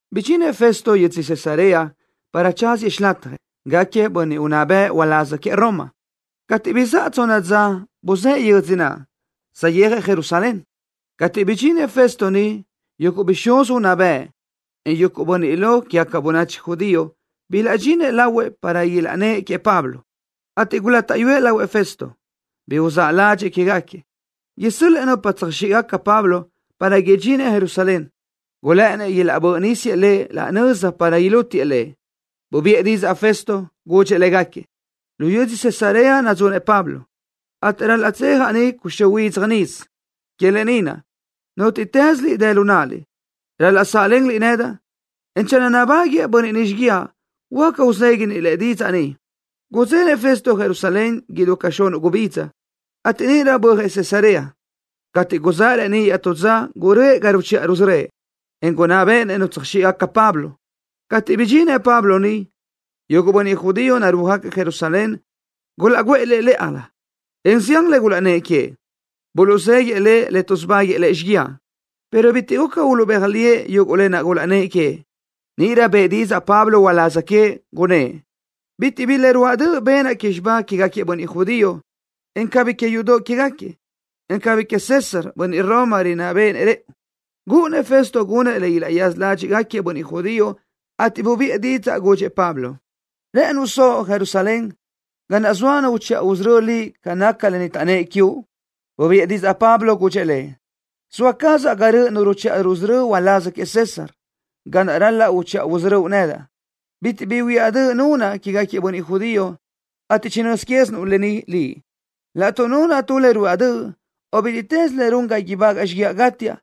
Bidxinëʼ Festo yödzö Cesarea para tsáziëʼ xilatjëʼ, gáquiëʼ bönniʼ unná bëʼ ulaz que Roma. Cateʼ bizáʼa tsonna dza buzë́ʼë yödzö naʼ, saʼyéajëʼ Jerusalén. Cateʼ bidxinëʼ Festo niʼ yuguʼ bixúz unná bëʼ, en yuguʼ bönniʼ lo quégaca bönachi judío bilaʼdxinëʼ lahuëʼ para ilaʼnnë́ʼ queëʼ Pablo, ateʼ gulátaʼyuëʼ lahuëʼ Festo bi uzáʼ ládxëʼë quégaquiëʼ, isö́l-lëʼë nupa tsöjxíʼgaca Pablo, para udxinëʼ Jerusalén. Gulë́ʼënnëʼ ilaʼbö́ʼ nísiëʼ lëʼ laʼ nöza para ilútiëʼ lëʼ. Bubiʼë didzaʼ Festo, gudxëʼ légaquiëʼ: —Lu yödzö Cesarea nadzunëʼ Pablo, ateʼ ral-laʼ tsejaʼ niʼ cuxö́ huidzaj nisö. Que lë ni naʼ, nútiʼtëslöliʼ dë lu náʼaliʼ, ral-laʼ sáʼlenliʼ nedaʼ, en channö nabáguëʼë bönniʼ niʼ xíguiaʼ, huáca uzéguiliʼ-nëʼ didzaʼ niʼ. Gudzenëʼ Festo Jerusalén idú ca xunuʼ gubidza, ateʼ níʼirö bö́ajëʼ Cesarea. Cateʼ guzáʼ reníʼ iaʼtú dza guröʼë ga ruchiʼa rusörö́ëʼ, en gunná béʼenëʼ nupa tsöjxíʼgaca Pablo. Cateʼ chibidxinëʼ Pablo niʼ, yuguʼ bönniʼ judío narúajgaquiëʼ Jerusalén gulaʼguʼë lëʼ lë́ʼalö, en zián le gulaʼnnë́ʼ queëʼ. Buluʼzéguiëʼ lëʼ le tuʼsubáguëʼë lëʼ xíguiaʼ, pero bitiʼ guca uluʼbéaj liëʼ yuguʼ lë naʼ gulaʼnnë́ʼ queëʼ. Níʼirö bëʼë didzaʼ Pablo uláz queëʼ, gunnë́ʼ: —Bitiʼ bi le ruáʼ döʼ benaʼ que xibá quégaquiëʼ bönniʼ judío, en cabí que yudoʼ quégaquiëʼ, en cabí queëʼ César, bönniʼ Roma, rinná béʼenëʼ rëʼu. Gúʼunnëʼ Festo gunëʼ le ilaʼyaza ládxiʼgaquiëʼ bönniʼ judío, ateʼ bubiʼë didzaʼ, gudxëʼ Pablo: —¿Rë́ʼënuʼ soʼo Jerusalén, ga naʼ soa nu uchiʼa usörö́ liʼ ca nácagaca lë ni taʼnnë́ʼ quiuʼ? Bubiʼë didzaʼ Pablo, gudxëʼ lëʼ: —Zoa cazaʼ ga röʼö nu ruchiʼa rusörö́ uláz queëʼ César, ga naʼ ral-laʼ uchiʼa usörö́uʼ nedaʼ. Bitiʼ bi huiáʼ döʼ nunaʼ quégaquiëʼ bönniʼ judío, ateʼ chinö́z quézinuʼ lë ni. Laʼtuʼ nunaʼ tu le ruáʼ döʼ, o bítiʼtës le run ga ibágaʼa xíguiaʼ gátiaʼ,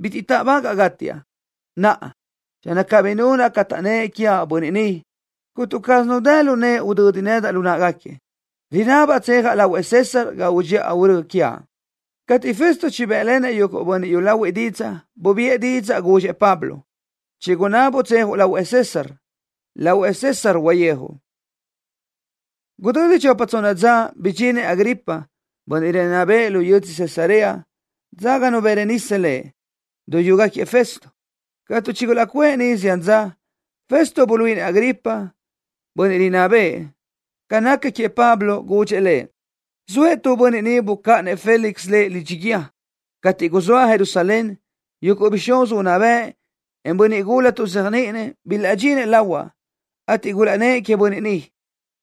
bitiʼ táʼbagaʼa gátiaʼ. Naʼa, channö cabí nunaʼ ca taʼnnë́ʼ quiaʼ bönniʼ ni, cuntu caz nu dë lu nëʼe udödi nedaʼ lu náʼagaquiëʼ. Rinabaʼ tsejaʼ lahuëʼ César ga udxiʼa urö́ quiaʼ. Cateʼ Festo chibë́ʼlenëʼ yuguʼ bönniʼ yúlahuiʼ didzaʼ, bubiʼë didzaʼ, gudxëʼ Pablo: —Chigunábuʼ tsejuʼ lahuëʼ César. Lahuëʼ César uyijuʼ. Gudödi chopa tsonna dza, bidxinëʼ Agripa, bönniʼ rinná bëʼë lu yödzö Cesarea, dzáganu Berenice lëʼ, duyúgaquiëʼ Festo. Cateʼ chigulaʼcuʼë niʼ zián dza, Festo buluíʼinëʼ Agripa, bönniʼ rinná bëʼë, ca naca queëʼ Pablo. Gudxëʼ lëʼ: —Zoëʼ tu bönniʼ ni bucáʼanëʼ Félix lëʼ lidxi guíë. Cateʼ guzóaʼ Jerusalén, yuguʼ bixúz unná bëʼ, en bönniʼ gula tuʼzéajniʼinëʼ, bilaʼdxinëʼ lahuaʼ, ateʼ gulaʼnnë́ʼ queëʼ bönniʼ ni.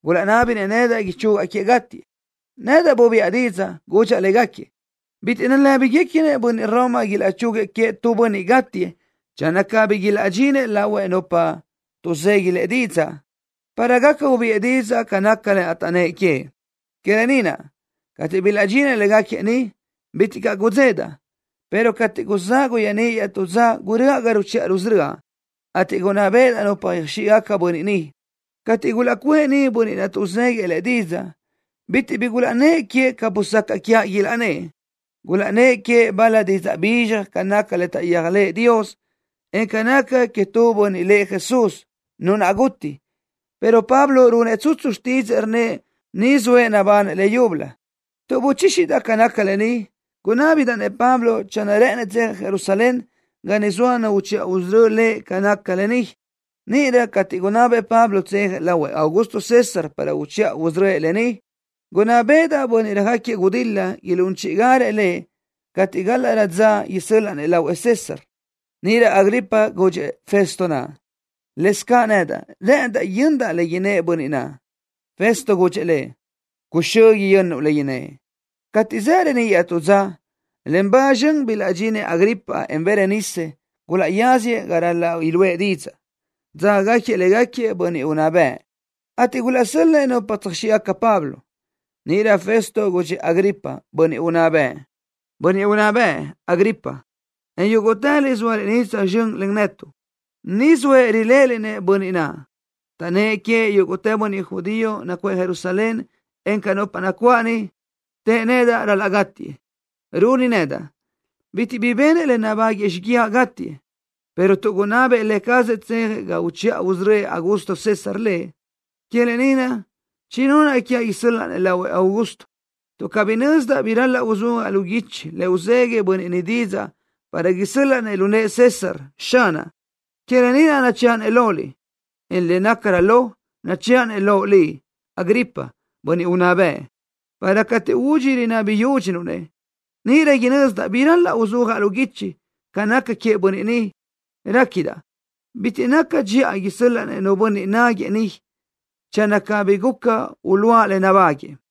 Gulaʼnábinëʼ nedaʼ ichugaʼ queëʼ gátiëʼ. Nedaʼ bubiʼa didzaʼ, gudxaʼ légaquiëʼ bitiʼ nalë́biguequinëʼ bönniʼ Roma ilaʼchúguiëʼ queëʼ tu bönniʼ gátiëʼ channö cabí ilaʼdxini lahuëʼ nupa tuʼzegui lëʼ didzaʼ, para gaca ubiʼë didzaʼ ca naca lë naʼ taʼnnë́ʼ queëʼ. Que lë ni naʼ, cateʼ bilaʼdxinëʼ légaquiëʼ ni, bitiʼ caʼ gudzedaʼ, pero cateʼ guzáʼ guyeaníʼ iaʼtú dza guröʼa ga ruchiʼa rusörö́aʼ, ateʼ gunná béʼedaʼ nupa yöjxíʼgaca bönniʼ ni. Cateʼ gulaʼcuʼë ni bönniʼ naʼ tuʼzéguiëʼ lëʼ didzaʼ, bitiʼ bi gulaʼnnë́ʼ queëʼ ca busacaʼ quiaʼ ilaʼnnë́ʼ. Gulaʼnnë́ʼ queëʼ bal-la didzaʼ bizxaj ca naca le taʼyéajlëʼë Dios, en ca naca queëʼ tu bönniʼ lëʼ Jesús, nu naʼ guti, pero Pablo runëʼ tsutsu xtídzëʼë rnnëʼ ni zoëʼ nabanëʼ leyúbölö. Tuʼ buchíxidaʼ ca nácagaca lë ni, gunábidaʼ-nëʼ Pablo channö rë́ʼënëʼ tsejëʼ Jerusalén, ga niʼ soa nu uchiʼa usörö́ lëʼ ca nácagaca lë ni. Níʼirö cateʼ gunabëʼ Pablo tsejëʼ lahuëʼ Augusto César para uchiʼa usörö́ëʼ lëʼ niʼ, gunná béʼedaʼ bönniʼ röjáquiëʼ gudil-la ilún chíʼigarëʼ lëʼ cateʼ gálaʼrö dza isö́l-laʼa-nëʼ lahuëʼ César. Níʼirö Agripa gudxëʼ Festo naʼ: —Lëzcaʼ nedaʼ rë́ʼëndaʼ yö́nidaʼ le innë́ʼ bönniʼ naʼ. Festo gudxëʼ lëʼ: —Cuxö́ yönnuʼ le innë́ʼ. Cateʼ zaʼ reníʼ iaʼtú dza, len ba zxön bilaʼdxinëʼ Agripa, en Berenice niʼ. Gulaʼyáziëʼ ga ral-laʼ iluʼë didzaʼ, dzágagaquiëʼ légaquiëʼ bönniʼ unná bëʼ, ateʼ gulaʼsö́l-lëʼë nupa tsöjxíʼgaca Pablo. Níʼirö Festo gudxëʼ Agripa, bönniʼ unná bëʼ: —Bönniʼ unná bëʼ, Agripa, en yúguʼtëliʼ zóaliʼ ni tsözxö́n len netuʼ. Ni zoëʼ riléʼeliʼ-nëʼ bönniʼ naʼ, taʼnnë́ʼ queëʼ yúguʼtë bönniʼ judío nacuʼë Jerusalén, encaʼ nupa nacuáʼ ni, tëʼ nedaʼ ral-laʼ gátiëʼ. Runi nedaʼ bitiʼ bi benëʼ le nabáguëʼë xíguiaʼ gátiëʼ, pero tuʼ gunabëʼ lë cazëʼ tsejëʼ ga uchiʼa usörö́ëʼ Augusto César lëʼ, que lë ni naʼ chinunaʼ quiaʼ isö́l-laʼa-nëʼ lahuëʼ Augusto. Tuʼ cabí nözdaʼ bi ral-laʼ uzúajaʼ lu guichi le uzegui bönniʼ ni didzaʼ para isö́l-laʼa lu nëʼë César, xanaʼ, que lë ni naʼ nachëʼa-nëʼ loliʼ, en le nácarö lo, nachëʼa-nëʼ loʼ liʼ, Agripa, bönniʼ unná bëʼ, para cateʼ údxi rinábini yudxuʼ-nëʼ, níʼirö inözdaʼ bi ral-laʼ uzúajaʼ lu guichi ca naca queëʼ bönniʼ ni. Réquidaʼ bitiʼ naca dxiʼa isö́l-laʼa-nëʼ nu bönniʼ náguëʼë niʼ channö cabí gaca uluʼa le nabáguëʼë.